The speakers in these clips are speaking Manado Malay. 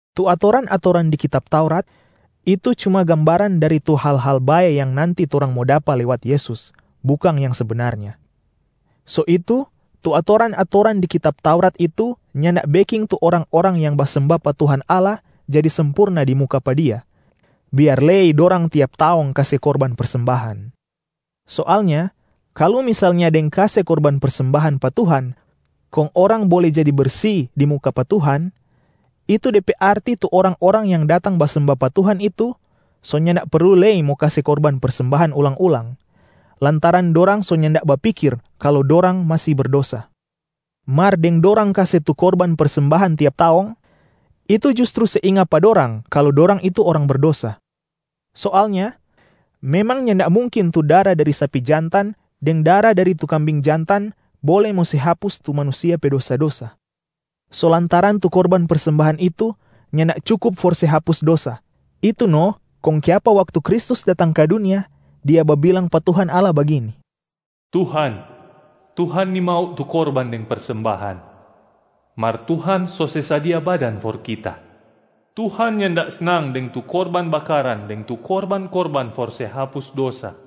Tu atoran-atoran di kitab Taurat, itu cuma gambaran dari tu hal-hal bae yang nanti torang mo dapa lewat Yesus, bukang yang sebenarnya. So itu, tu atoran-atoran di Kitab Taurat itu nyanda beking tu orang-orang yang basemba pa Tuhan Allah jadi sempurna di muka pa Dia, biar lei dorang tiap taong kase korban persembahan. Soalnya kalu misalnya deng kase korban persembahan pa Tuhan kong orang bole jadi bersi di muka pa Tuhan, itu de pe arti tu orang-orang yang datang basemba pa Tuhan itu so nyanda perlu lei mo kase korban persembahan ulang-ulang, lantaran dorang so nyanda bapikir kalu dorang masi berdosa. Mar deng dorang kase tu korban persembahan tiap taong, itu justru se inga pa dorang kalu dorang itu orang berdosa. Soalnya memang nyanda mungkin tu dara dari sapi jantan deng dara dari tu kambing jantan bole mo se hapus tu manusia pe dosa-dosa. So lantaran tu korban persembahan itu nyanda cukup for se hapus dosa, itu no kong kiapa waktu Kristus datang ka dunia, Dia babilang pa Tuhan Allah bagini, “Tuhan, Tuhan nimau tu korban deng persembahan, mar Tuhan so se sadia badan for Kita. Tuhan nyanda snang deng tu korban bakaran deng tu korban-korban for se hapus dosa.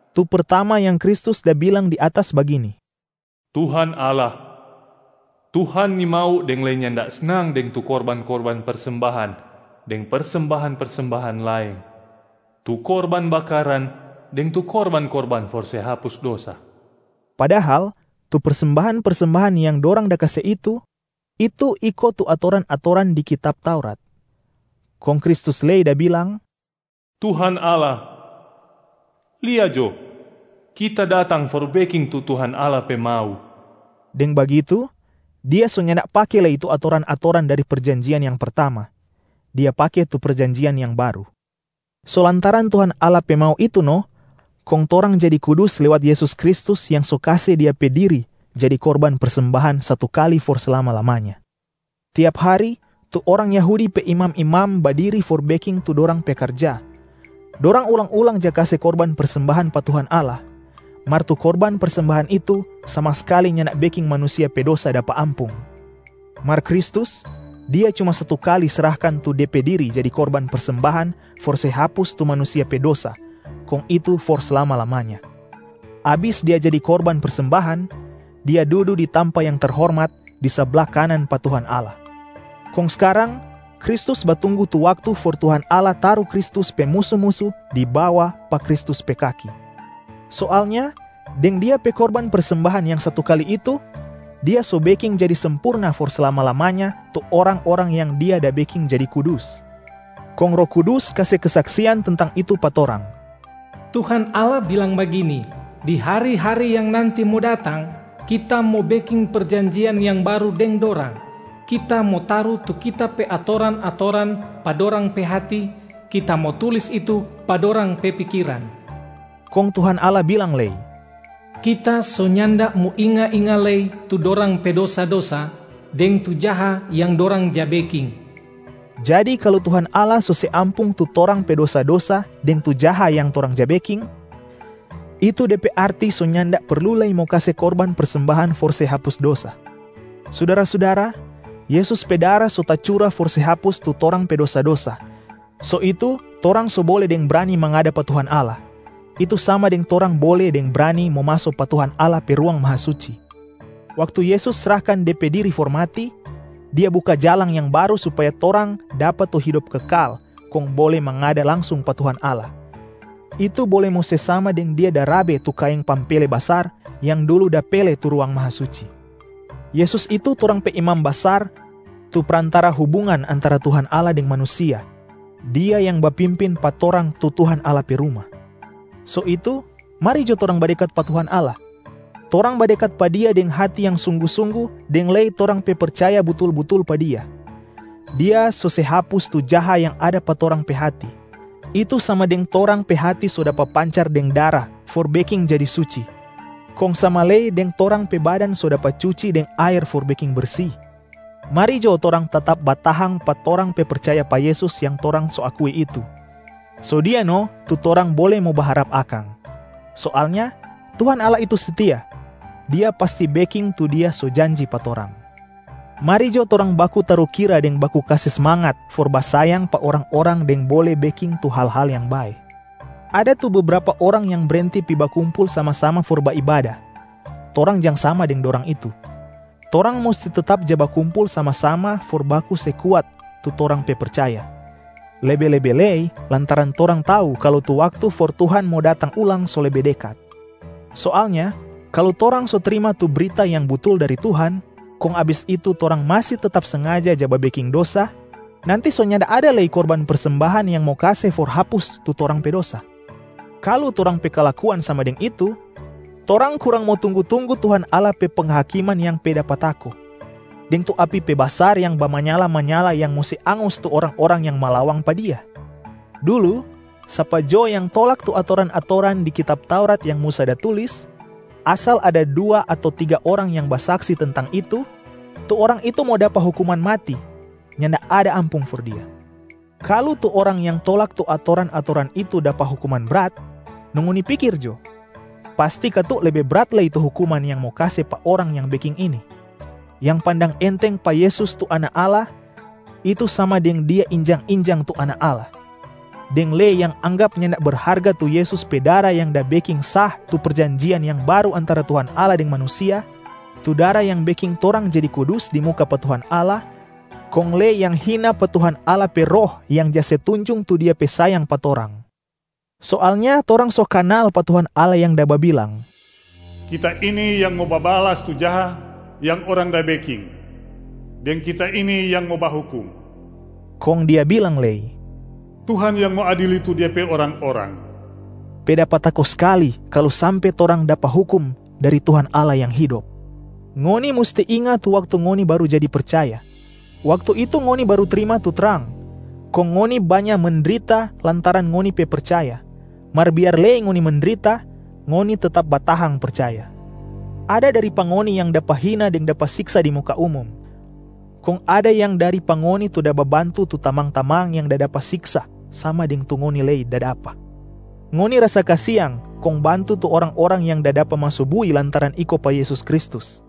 Tu pertama yang Kristus da bilang di atas bagini, “Tuhan Allah, Tuhan nimau deng lei nyanda snang deng tu korban-korban persembahan deng persembahan-persembahan laeng, tu korban bakaran deng tu korban-korban for se hapus dosa.” Padahal tu persembahan-persembahan yang dorang da kase itu, itu iko tu atoran-atoran di kitab Taurat. Kong Kristus lei da bilang, “Tuhan Allah! Lia jo, Kita datang for beking tu Tuhan Allah pe mau.” Deng bagitu, Dia so nyanda pake lei tu atoran-atoran dari perjanjian yang pertama, Dia pake tu perjanjian yang baru. So lantaran Tuhan Allah pe mau itu no kong torang jadi kudus lewat Yesus Kristus yang so kase Dia pe diri jadi korban persembahan satu kali for slama-lamanya. Tiap hari, tu orang Yahudi pe imam-imam badiri for beking tu dorang pe karja, dorang ulang-ulang ja kase korban persembahan pa Tuhan Allah. Mar tu korban persembahan itu sama skali nyanda beking manusia pe dosa dapa ampung. Mar Kristus, Dia cuma satu kali srahkan tu Dia pe diri jadi korban persembahan for se hapus tu manusia pe dosa, kong itu for slama-lamanya. Abis Dia jadi korban persembahan, Dia dudu di tampa yang terhormat, di sabla kanan pa Tuhan Allah. Kong skarang Kristus batunggu tu waktu for Tuhan Allah taru Kristus pe musu-musu di bawa pa Kristus pe kaki. Soalnya deng Dia pe korban persembahan yang satu kali itu, Dia so beking jadi sempurna for slama-lamanya tu orang-orang yang Dia da beking jadi kudus. Kong Roh Kudus kase kesaksian tentang itu pa torang, “Tuhan Allah bilang bagini, ‘Di hari-hari yang nanti mo datang, Kita mo beking perjanjian yang baru deng dorang. Kita mo taru tu Kita pe atoran-atoran pa dorang pe hati, Kita mo tulis itu pa dorang pe pikiran.’” Kong Tuhan Allah bilang lei, “Kita so nyanda mo inga-inga lei tu dorang pe dosa-dosa, deng tu jaha yang dorang ja beking.” Jadi kalu Tuhan Allah so se ampung tu torang pe dosa-dosa deng tu jaha yang torang ja beking, itu de pe arti so nyanda perlu lei mo kase korban persembahan for se hapus dosa. Sudara-sudara, Yesus pe dara so tacura for se hapus tu torang pe dosa-dosa, so itu torang so bole deng brani mangada pa Tuhan Allah, itu sama deng torang bole deng brani mo maso pa Tuhan Allah pe Ruang Mahasuci. Waktu Yesus srahkan Dia pe diri for mati, Dia buka jalang yang baru supaya torang dapa tu hidop kekal kong bole mangada langsung pa Tuhan Allah, itu bole mo se sama deng Dia da rabe tu kaeng pampele basar yang dulu da pele tu Ruang Mahasuci. Yesus itu torang pe Imam Basar tu Prantara hubungan antara Tuhan Allah deng manusia, Dia yang bapimpin pa torang tu Tuhan Allah pe ruma. So itu, mari jo torang badekat pa Tuhan Allah. Torang badekat pa Dia deng hati yang sunggu-sunggu deng lei torang pe percaya butul-butul pa Dia. Dia so se hapus tu jaha yang ada pa torang pe hati, itu sama deng torang pe hati so dapa pancar deng dara for beking jadi suci, kong sama lei deng torang pe badan so dapa cuci deng aer for beking bersi. Mari jo torang tetap batahang pa torang pe percaya pa Yesus yang torang so akui itu, so Dia no tu torang bole mo baharap akang. Soalnya Tuhan Allah itu setia, Dia pasti beking tu Dia so janji pa torang. Mari jo torang baku tarukira deng baku kase smangat for basayang pa orang-orang deng bole beking tu hal-hal yang bae. Ada tu bebrapa orang yang brenti pi bakumpul sama-sama for baibada, torang jang sama deng dorang itu. Torang musti tetap ja bakumpul sama-sama for baku se kuat tu torang pe percaya, lebe-lebe lei lantaran torang tau kalu tu waktu for Tuhan mo datang ulang so lebe dekat. Soalnya kalu torang so trima tu brita yang butul dari Tuhan, kong abis itu torang masi tetap sengaja ja babeking dosa, nanti so nyanda ada lei korban persembahan yang mo kase for hapus tu torang pe dosa. Kalu torang pe kalakuan sama deng itu, torang kurang mo tunggu-tunggu Tuhan Allah pe penghakiman yang pe dapa tako, deng tu api pe basar yang bamanyala-manyala yang mo se angus tu orang-orang yang malawang pa Dia. Dulu sapa jo yang tolak tu atoran-atoran di kitab Taurat yang Musa da tulis, asal ada dua ato tiga orang yang basaksi tentang itu, tu orang itu mo dapa hukuman mati, nyanda ada ampung for dia. Kalu tu orang yang tolak tu atoran-atoran itu dapa hukuman brat, no ngoni pikir jo, pasti katu lebe brat lei tu hukuman yang mo kase pa orang yang beking ini: yang pandang enteng pa Yesus tu Anak Allah, itu sama deng dia injang-injang tu Anak Allah, deng lei yang anggap nyanda berharga tu Yesus pe dara yang da beking sah tu perjanjian yang baru antara Tuhan Allah deng manusia, tu dara yang beking torang jadi kudus di muka pa Tuhan Allah, kong lei yang hina pa Tuhan Allah pe Roh yang ja se tunjung tu Dia pe sayang pa torang. Soalnya torang so kanal pa Tuhan Allah yang da babilang, “Kita ini yang mo babalas tu jaha yang orang da beking, deng Kita ini yang mo bahukum.” Kong Dia bilang lei, “Tuhan yang mo adili tu Dia pe orang-orang.” Pe dapa tako skali kalu sampe torang dapa hukum dari Tuhan Allah Yang Hidop. Ngoni musti inga tu waktu ngoni baru jadi percaya, waktu itu ngoni baru trima tu trang, kong ngoni banya mendrita lantaran ngoni pe percaya, mar biar lei ngoni mendrita, ngoni tetap batahang percaya. Ada dari pa ngoni yang dapa hina deng dapa siksa di muka umum, kong ada yang dari pa ngoni tu da babantu tu tamang-tamang yang da dapa siksa sama deng tu ngoni lei da dapa. Ngoni rasa kasiang kong bantu tu orang-orang yang da dapa maso bui lantaran iko pa Yesus Kristus.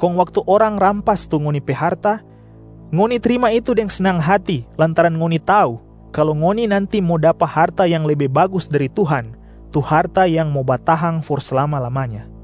Kong waktu orang rampas tu ngoni pe harta, ngoni trima itu deng snang hati lantaran ngoni tau kalu ngoni nanti mo dapa harta yang lebe bagus dari Tuhan, tu harta yang mo batahang for slama-lamanya.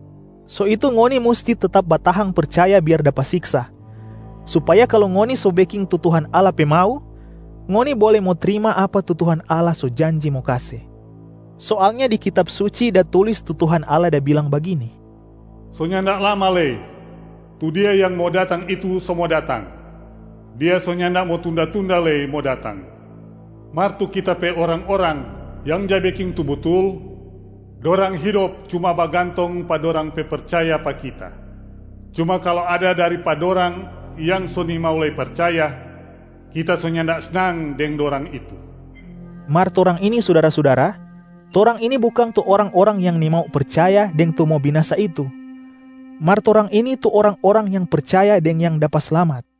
So itu ngoni musti tetap batahang percaya biar dapa siksa, supaya kalu ngoni so beking tu Tuhan Allah pe mau, ngoni bole mo trima apa tu Tuhan Allah so janji mo kase. Soalnya di Kitab Suci da tulis tu Tuhan Allah da bilang bagini, “So nyanda lama lei, tu Dia yang mo datang itu so mo datang, Dia so nyanda mo tunda-tunda lei mo datang. Mar tu Kita pe orang-orang yang ja beking tu butul, dorang hidop cuma bagantong pa dorang pe percaya pa Kita. Cuma kalu ada dari pa dorang yang so nimau lei percaya, Kita so nyanda snang deng dorang itu.” Mar torang ini sudara-sudara, torang ini bukang tu orang-orang yang nimau percaya deng tu mo binasa itu, mar torang ini tu orang-orang yang percaya deng yang dapa slamat.